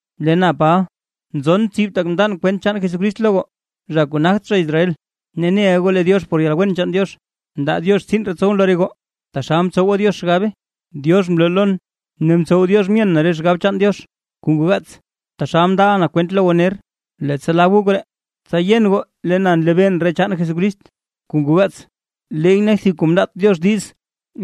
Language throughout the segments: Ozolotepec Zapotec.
Lee na Paba, nzon tsib tak mndan kwent chaan Jesucrist lo goo, zha kuu nagt zha Israel. Ne neʼa goo lee Diox por yalwen chaan Diox, mndaa Diox tsiin ree tsowʼn lo re goo, taxal mtsowa Diox xgabe. Diox mloo lon ne mtsow Diox myen na re xgab chaan Diox kuu ngoo gaats, taxal mndaʼa na kwente lo goo ner. Leettsa lab goo koree, tsa yen goo lee na nlebeen re chaan Jesucrist kuu ngoo gaats, leey nak thib kuu mndaat Diox diiz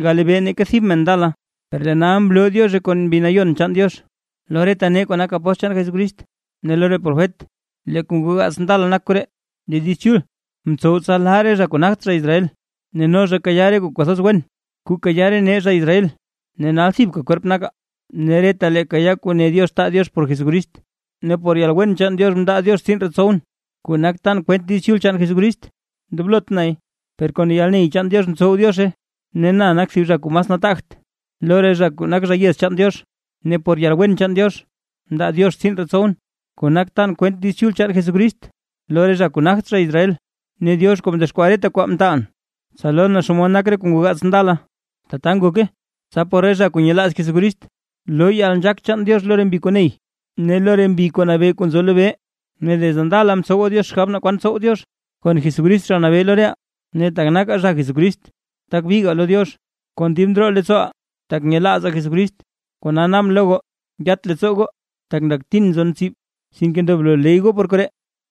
galebee neeka thib mene ndala, per lee nal mloo Diozhe kon Mbi Nayon chaan Diox, lo reta nee kuu nak apóstl chaan Jesucrist ne lo re profet. Lee kuu ngoo gaats ndala nak koree: Lee Diiz Chul ntsow tsa lee re zha kuu nagt zha Israel, no zha kayaa re kuu kwathoz wen kuu kayaa re nee zha Israel ne nal thibka kwerp nakaa, ne retalee kayaa kuu ne Diox taa Diox por Jesucrist. Ne por yalwen chaan Diox mndaa Diox tsiin ree tsowʼn, kuu nak tan kwent Diiz Chul chaan Jesucrist, ndoblot nay; per kon yalney chaan Diox mtsow Diozhe. Ne na nak thib zha kuu mas nataagt lo re zha kuu nak zha yez chaan Diox; per por yalwen chaan Diox mndaa Diox tsiin ree tsowʼn, kuu nak tan kwent Diiz Chul chaan Jesucrist lo re zha kuu nagt zha Israel. Ne Diox kuu mdexkwaa reta kwaa mtaalʼn, tsa lon naa xomod nak re kuu ngoo gaats ndala. Tata ngoke, tsa por re zha kuu nyelaaz Jesucrist loo yalnzhaak chaan Diox lo re mbi kuu ney ne lo re mbi kuu nabee kuu nzo lobee. Ne desde ndala mtsowa Diox xgab naa kwan tsow Diox kon Jesucrist Zha Nabee lo reʼaa. Ne tak nakaa zha Jesucrist, tak bigaa lo Diox kon dib ndroo leettsooʼaa, tak nyelaazaa Jesucrist. Kona naabʼn lo goo, yat leettsoo goo, tak ndaktin nzon tsib, sinke ndoblo ley goo por koree.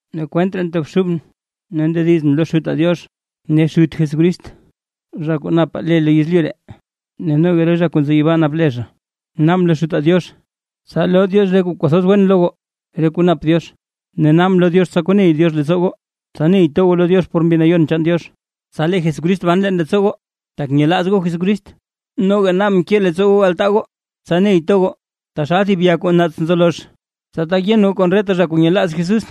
Ne kwent ree ntobxubʼn ne ndedizʼn lo Xutaa Diox ne Xut Jesucrist, zha kuu napaa le lo yezlyu ree ne noga re zha kuu nzo yibaa nap le zha. Naabʼn lo Xutaa Diox, tsa loo Diox re kuu kwathoz wen lo goo re kuu nap Diox, ne naabʼn lo Diox tsa koney Diox leettsoo goo, tsa ney to goo lo Diox por Mbi Nayon chaan Diox, tsa lee Jesucrist ban leen leettsoo goo tak nyelaaz goo Jesucrist. Noga naabʼn ke leettsoo goo altaa goo tsa ney to goo, taxal thib ya kuu naats nzo lozh. Tsa tak yen goo kon reta zha kuu nyelaaz Jesús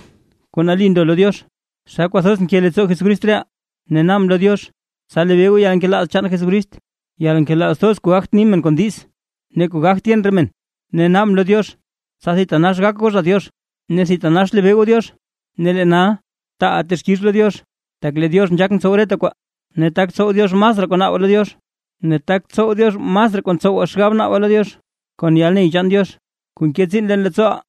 kuu nali ndo lo Diox, xa kwathoz nke leettsoo Jesucrist reʼaa. Ne naabʼn lo Diox, tsa lebee goo yalnkelaaz chaan Jesucrist, yalnkelaaz thoz kuu gagt ni men kon diiz ne kuu gagt yen re men, ne naabʼn lo Diox tsa thitanax gak goo zha Diox ne thitanax lebee goo Diox. Ne lee nal, taaʼaa texkix lo Diox, tak lee Diox nzhaak ntsow reta kwaa, ne tak tsow Diox masraa kuu naabaa lo Diox, ne tak tsow Diox masraa kuu ntsowaa xgab naabaa lo Diox, kon yalney chaan Diox kuu nke tsiin leen leettsooʼaa.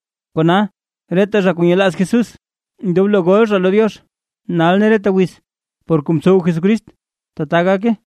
¡Reta zha kuu nyelaaz Jesús ndoblo gol zha lo Diox, nal ne reta wiz, por kuu mtsow Jesucrist! Tata gake.